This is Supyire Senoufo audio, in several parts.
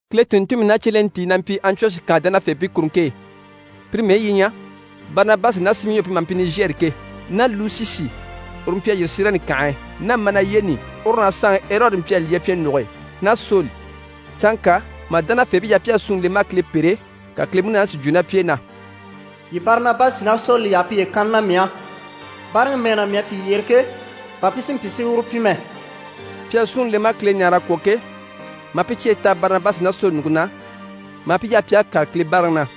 Kile tùnntunmii ná cyelentii na mpyi Antiyɔshi kànhe dánafeebii kuruŋke e. Pire mɛyi yi ɲyɛ: Barinabasi ná Simiyɔn pi maha mpyi: «Nizhɛri» ke, ná Lusisi uru mpyi a yîri Sirɛni kànhe e, ná Manayeni uru ná saanŋi Erɔdi mpyi a lyɛ pyɛnnuge e, ná Soli. Canŋka mà dánafeebii yaha pi a súnŋi le maa Kile pêre, ka Kile Munaani si jwo ná pi e na: «Yii Barinabasi ná Soli yaha piye kanni na mii á, báaraŋi mɛɛ na mii à pi yyere ke, bà pi si mpyi si uru pyi mɛ.» Pi à súnŋi le maa Kile ɲáare a kwɔ̀ ke, maa pi cyeyi taha Barinabasi ná Soli ɲùŋke na, maa pi yaha pi à kàre Kile báaraŋi na.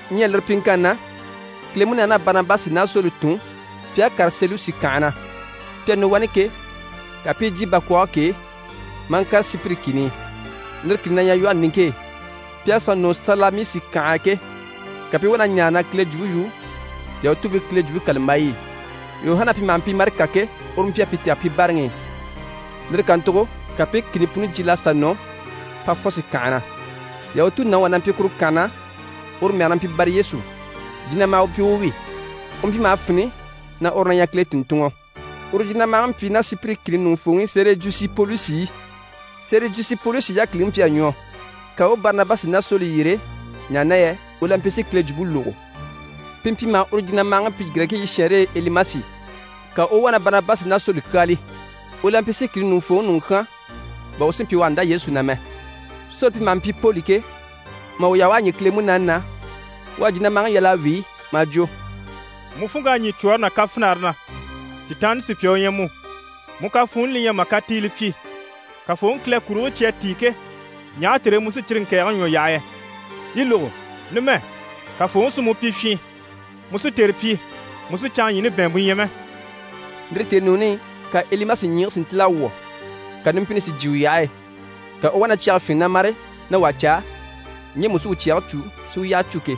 Ɲyɛ lire pyiŋkanni na, Kile Munaani à Barinabasi ná Soli tun pi à kàre Selusi kànhe na. Pi à nɔ wani ke, ka pi i jyè bakwɔɔge k'e maa ŋkàre Sipiri kìni i, lire kìni na ɲyɛ lwɔhe niŋke e. Pi à sà nɔ Salamisi kànhe e ke, ka pi i wá na ɲaare na Kile jwumpe yu YahutuubiiKile Jwumpe kàlambayi i. Yuhana pi maha mpyi: «Marika» ke, uru mpyi a pi tɛ̀gɛ pi báaraŋi i. Lire kàntugo ka pi i kìni puni jyiil'a sà nɔ Pafɔsi kànhe na. Yahutu nàŋi wà na mpyi kuru kànhe na, uru mɛge na mpyi Bariyesu. Jinamaha u mpyi u wi. U mpyi maha fini na uru na ɲyɛ Kile tùnntunŋɔ. Uru jinamahaŋi mpyi ná Sipiri kìni ɲùŋufooŋi Sɛrijusi Polusi i. Sɛrijusi Polusi yákiliŋi mpyi a ɲwɔ, ka u u Barinabasi ná Soli yyere, ɲaha na yɛ u la mpyi si Kile jwumpe lógo. Pi mpyi maha uru jinamahaŋi pyi Girɛkiibii shɛɛnre e: «Elimasi». Ka u u wá na Barinabasi ná Soli kyáali. U la mpyi si kìni ɲùŋufooŋi ɲùŋɔ kyán bà u si mpyi u àha ndá Yesu na mɛ. Soli pi maha mpyi: «Poli» ke, mà u yaha u a ɲî Kile Munaani na, u à jinamahaŋi yal'a wíi, maa jwo: «Mu funŋk'à ɲî cwɔ̀ɔre ná kafinare na, Sitaanniŋi sùpya u ɲyɛ mu, mu kafuunni li ɲyɛ mà katiile pyi. Kafooŋi Kile kurigii cyi à tíi ke, ɲaha tère e mu sí cyire ŋkɛ̀ɛgɛŋi ɲwɔ yaha yɛ? Yi lógo! Numɛ, Kafooŋi sí mu pyi fyin. Mu sí tère pyi, mu sì canŋaɲyiini bɛ̀ɛnmpe ɲya mɛ.» Lire tèenuuni i, ka Elimasi ɲyiigii si ntíl'a wwɔ̀, ka numpini si jyè u yyahe e, ka u u wá na cyɛge fyínge na mâre na wà caa ŋgemu u si u cyɛge cû, si u yyaha cû ke.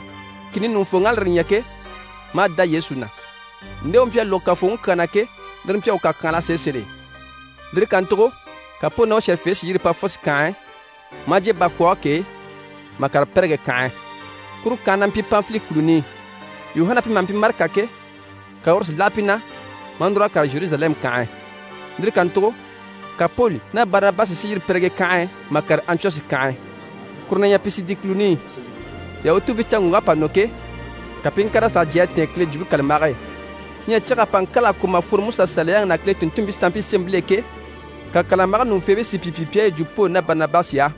Kìni ɲùŋufooŋ'à lire ɲya ke, maa dá Yesu na. Nde u mpyi a lógo Kafooŋi kyaa na ke, lire mpyi a u kàkyanhala sèe sèl'e. Lire kàntugo ka Poli ná u shɛ̀rɛfeebii si yîri Pafɔsi kànhe e, maa jyè bakwɔɔge k'e mà kàre Pɛrigɛ kànhe e, kuru kànhe na mpyi Panfili kùluni i. Yuhana pi maha mpyi: «Marika» ke, ka uru si láha pi na, maa núr'a kàre Zheruzalɛmu kànhe e. Lire kàntugo ka Poli ná Barinabasi si yîri Pɛrigɛ kànhe e mà kàre Antiyɔshi kànhe e, kuru na ɲyɛ Pisidi kùluni i. Yahutuubiicanŋɔŋk'à pa nɔ ke, ka pi i ŋkàr'a sà jyè a tɛ̀ɛn Kile Jwumpe kàlambage e. Ɲyɛ cyag'à pa ŋkâla a kwɔ̀ mà fworo MusaSaliyaŋi ná Kile tùnntunmpii sanmpii sémɛbil'e ke, ka kàlambage ɲùŋufeebii si pi pyi pi à yi jwo Poli ná Barinabasi á: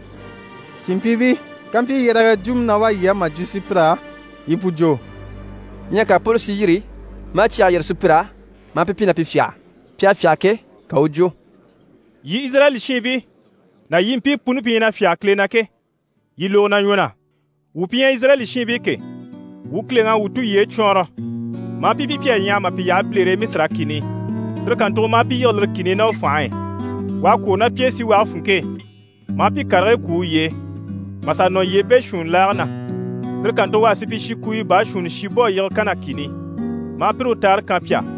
«Cìnmpyiibii, kampyi yɛrɛgɛ jwumɔ na wá yii á mà jwo sùpyir'á, yii pu jwo.» Ɲyɛ ka Poli si yîri, maa cyɛge yîrige sùpyir'á, maa pi pyi na pi fyâha. Pi à fyâha ke, ka u u jwo: «Yii Izirayɛli shiinbii ná yii mpii puni pi ɲyɛ na fyáge Kile na ke, yii lógo na ɲwɔ na. Wuu pi ɲyɛ Izirayɛli shiŋi ke, wuu u Kileŋi à wuu tulyeyi cwɔɔnrɔ, maa pi pyi pi à ɲyaha mà pi yaha bilere e Misira kìni i. Lire kàntugo maa pi yige lire kìni i ná u fànhe e. U à kwôro ná pi e síwage funŋke e, maa pi karigii kwú uye e, mà sà nɔ yyee beeshuunni laage na. Lire kàntugo u à supyishi kuuyo baashuunni shi bò a yige Kana kìni i, maa pire u taare kan pi á.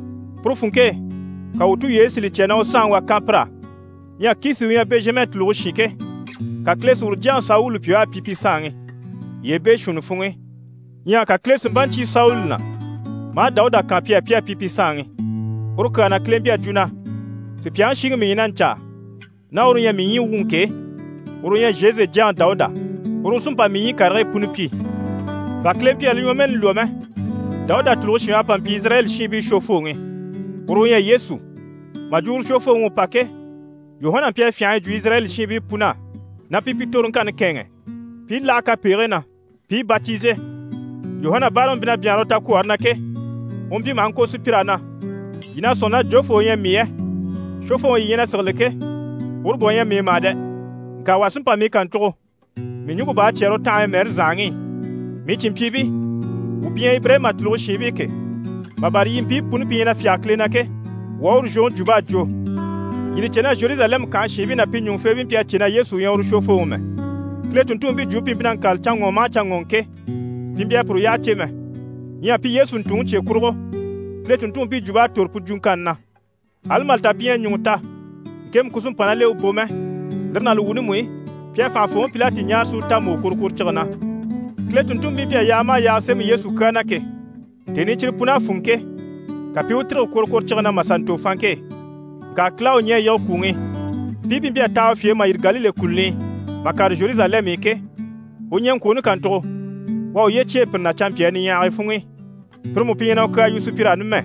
Puru funŋke e, ka wuu tulyeyi si li cya na u saanŋi wà kan pir'á. Ɲyɛ Kisi u ɲyɛ Bɛnzhama u tùluge shin ke, ka Kile si uru jyaŋi Sawuli pyi u à pyi pi saanŋi yyee beeshuunni funŋ'i. Ɲyɛ ka Kile si mpa ɲcyé Sawuli na, maa Dawuda kan pi á, pi à pyi pi saanŋi. Uru kyaa na Kile à jwo na “Sùpyaŋi shiŋi mii ɲyɛ na ɲcaa, ná uru u ɲyɛ mii ɲyii wuŋi ke, uru u ɲyɛ Zhese jyaŋi Dawuda. Uru u sí n‑pa mii ɲyii karigii puni pyi.” Bà Kile mpyi a li ɲwɔmɛɛni lwɔ́ mɛ, Dawuda tùluge shin u à pa mpyi Izirayɛli shiinbii Shwofooŋi. Uru u ɲyɛ Yesu. Mà jwo uru Shwofooŋi u pa ke, Yuhana mpyi a fyânha a yi jwo Izirayɛli shiinbii pun'á, na pi pi toroŋkanni kɛ̂ɛnŋɛ pi i láha kapegigii na, pi i batize. Yuhana báaraŋi mpyi na byanhare u takwɔɔre na ke, u mpyi maha ŋko sùpyir'á na “Yii na sɔ̂nŋi na jofoo u ɲyɛ mii yɛ? Shwofooŋi yii ɲyɛ na sigili ke, uru bà u ɲyɛ mii mà dɛ! Ŋka wà sí n‑pa mii kàntugo, mii ɲùŋke bá à cyɛ́rɛ u tanhaɲyi mɛɛre zànhaŋi i.” Mii cìnmpyiibii, wuu pi ɲyɛ Ibirayima tùluge shiinbii ke, mà bâra yii mpii puni pi ɲyɛ na fyáge Kile na ke, wuu á uru zhwoŋi jwump'à jwo. Yii li cè na Zheruzalɛmu kànhe shiinbii ná pi ɲùŋufeebii mpyi a cè na Yesu u ɲyɛ uru Shwofooŋi mɛ. Kile tùnntunmpii jwumpe pi mpyi na ŋkâlali canŋɔŋɔ maha canŋɔŋɔ ke, pi mpyi a puru yyaha cè mɛ. Ɲyɛ pi Yesu ntùnŋi cye kurugo, Kile tùnntunmpii jwump'à tòro pu jwuŋkanni na. Ali mà li ta pi ɲyɛ a ɲùŋɔ ta, ŋkemu ku sí n‑pa ná l'e u bò mɛ, lire ná li wuuni mú i, pi à fànhafooŋi Pilati ɲáare si u ta mbò kworokworocige na. Kile tùnntunmpii mpyi a yaaga maha yaaga sémɛ Yesu kyaa na ke, tèni i cyire pun'à fûnŋɔ ke, ka pi i u tîrige kworokworocige na mà sà ntò fanŋke e. Ŋka Kile à u ɲɛ̀ a yige kwùŋi i. Mpii pi mpyi a taha u fye e mà yîri Galile kùluni i, mà kàre Zheruzalɛmu i ke, u ɲɛŋkwooni kàntugo, u à uye cyêe pire na canmpyaa niɲyahagii funŋ'i. Pire mú pi ɲyɛ na u kyaa yu sùpyir'á numɛ.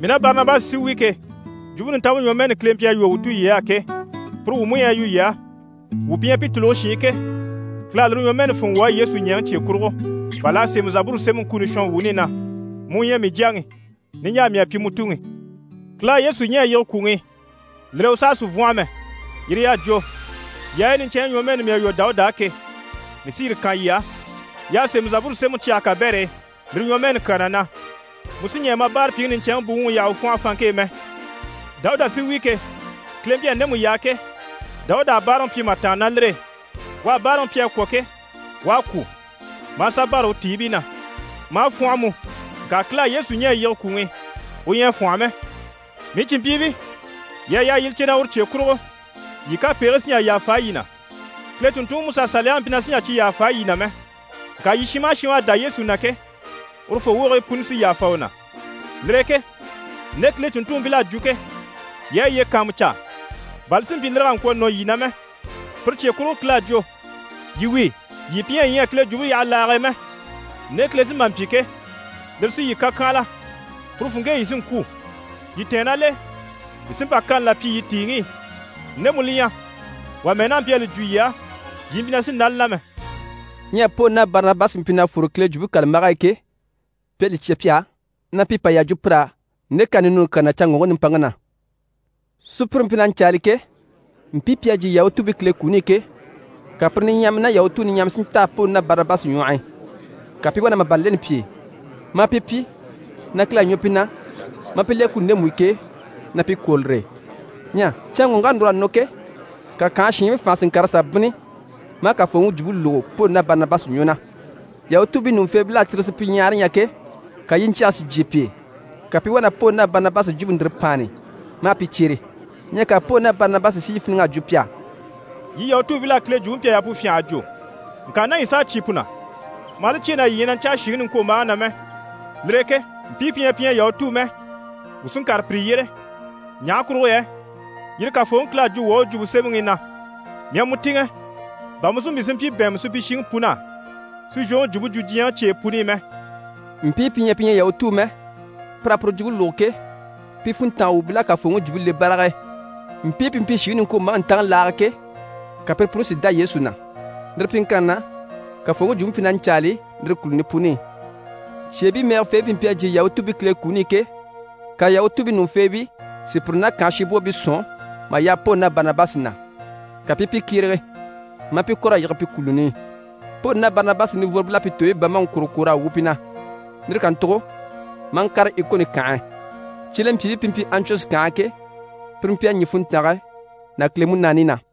Mii ná Barinabasi sí wi ke, Jwumpe Nintanmpe ɲwɔmɛɛni Kile mpyi a lwɔ́ wuu tulyey'á ke, puru wuu mú ɲyɛ na yu yii á. Wuu pi ɲyɛ pi tùluge shiin ke, Kile à lire ɲwɔmɛɛni fûnŋɔ wuu á, Yesu ɲɛ̀ŋi cye kurugo, bà l'à sémɛ Zaburu sémɛŋi kuni shɔnwuuni i na “Mu u ɲyɛ mii Jyaŋi, Niɲjaa mii à pyi mu Tuŋi.” Kile à Yesu ɲɛ̀ a yige kwùŋi i, lire e u saha sì n‑fwɔ́nhɔ mɛ, yire y'à jwo “Yaayi niɲcɛnɲyi ɲwɔmɛɛni mii à lwɔ́ Dawuda á ke, mii sí yire kan yii á.” Y'à sémɛ Zaburu sémɛŋi cyage kabɛr'e lire ɲwɔmɛɛni kyaa na na “Mu sì ɲɛɛ ma báarapyiŋi niɲcɛnŋi buwuŋi yaha u fwɔ́nhɔ fanŋke e mɛ.” Dawuda sí wi ke, Kile mpyi a ndemu yaa ke, Dawuda à báaraŋi pyi mà tàanna ná lire e. U à báaraŋi pyi a kwɔ̀ ke, u a kwû, maa sà bâra u tiibii na, maa fwɔ́nhɔ mú. Ŋka Kile à Yesu ɲɛ̀ a yige kwùŋi i, u ɲyɛ a fwɔ́nhɔ mɛ. Mii cìnmpyiibii, yii à yaa yii li cè na uru cye kurugo, yii kapegigii sí n‑jà yàfa yii na. Kile tùnntunŋi Musa Saliyaŋi mpyi na sì n‑jà cyi yàfa yii na mɛ. Ŋka yii shin maha shin u à dá Yesu na ke, urufoo wogigii puni sí yàfa u na. Lire e ke nde Kile tùnntunmpil'à jwo ke, yii a yiye kàanmucaa, bà li si mpyi lire kà ŋkwɔ̀ nɔ yii na mɛ. Pire cye kurugo Kile à jwo “Yii wíi, yii pi ɲyɛ yii ɲyɛ a Kile jwumpe yaha laage e mɛ, nde Kile sí n‑pa n‑pyi ke, lire sí yii kàkyanhala, puru funŋke e yii sí n‑kwû. Yii tɛ̀ɛn ná l'e, mii sí n‑pa kani là pyi yii tìiŋi i, ndemu li ɲyɛ, wà mɛ́ɛ n'a mpyi a li jwo yii á, yii mpyi na sì n‑dá li na mɛ.”» Ɲyɛ Poli ná Barinabasi mpyi na fwore Kile Jwumpe kàlambage e ke, pi à li cya pi á, na pi pa yà jwo pir'á nde kani ninuuni kyaa na canŋɔŋke nimpaŋke na. Sùpyire mpyi na ɲcaali ke, mpii pi à jyè Yahutuubii Kile kuni i ke, ka pire niɲyahamii ná Yahutuu niɲyahamii si ntaha Poli ná Barinabasi ɲwɔh'i, ka pi i wá na màban leni pi e, maa pi pyi, na Kile à ɲwɔ pi na maa pi le kuni ndemu i ke, na pi kwôro lire e. Ɲyɛ canŋɔŋk'à núr'a nɔ ke, ka kànhe shiinbii fànha si ŋkàr'a sà bínni, maa Kafooŋi Jwumpe lógo Poli ná Barinabasi ɲwɔ na. Yahutuubii ɲùŋufeebil'à tire supyiɲyahare ɲya ke, ka yiɲcyɛge si jyè pi e, ka pi i wá na Poli ná Barinabasi jwumpe ndire páanni, maa pi cyere. Ɲyɛ ka Poli ná Barinabasi si yi fíniŋ'à jwo pi á: «Yii Yahutuubil'á, Kile Jwumpe mpyi a yaa pu fyânha a jwo. Ŋka ná yii s'à cyé pu na, maa li cyêe na yii ɲyɛ na ɲcaa shìŋi niŋkwombaaŋi na mɛ, lire e ke mpii pi ɲyɛ pi ɲyɛ Yahutuu mɛ, wuu sí n‑kàre pire yyére. Ɲaha kurugo yɛ yire Kafooŋi Kile à jwo wuu á u Jwumpe Semɛŋi i na “Mii à mu tìŋɛ, bà mu si mpyi si mpyi bɛ̀ɛnmɛ supyishiŋi pun'á, si zhwoŋi jwumpe jwo diɲyɛŋi cyeyi puni i mɛ.”» Mpii pi ɲyɛ pi ɲyɛ Yahutuu mɛ, pir'à puru jwumpe lógo ke, pi funntanga wuubil'à Kafooŋi Jwumpe le barag'e. Mpii pi mpyi shìŋi niŋkwombaaŋi ntaŋi laage e ke, ka pire puni si dá Yesu na. Lire pyiŋkanni na, Kafooŋi Jwumpe mpyi na ɲcaali lire kùluni puni i. Cyeebii mɛgɛfeebii pi mpyi a jyè Yahutuubii Kile kuni i ke, ka Yahutuubii ɲùŋufeebii si pire ná kànhe shinbwoobii sɔ̀n mà yaha Poli ná Barinabasi na, ka pi i pi kyérege, maa pi kɔ̀r'a yige pi kùluni i. Poli ná Barinabasi nivworobil'à pi tooyi bambaŋi kwòro kwòr'a wu pi na. Lire kàntugo maa ŋkàre Ikoni kànhe e. Cyelempyiibii pi mpyi Antiyɔshi kànhe e ke, pire mpyi a ɲî funntange ná Kile Munaani na.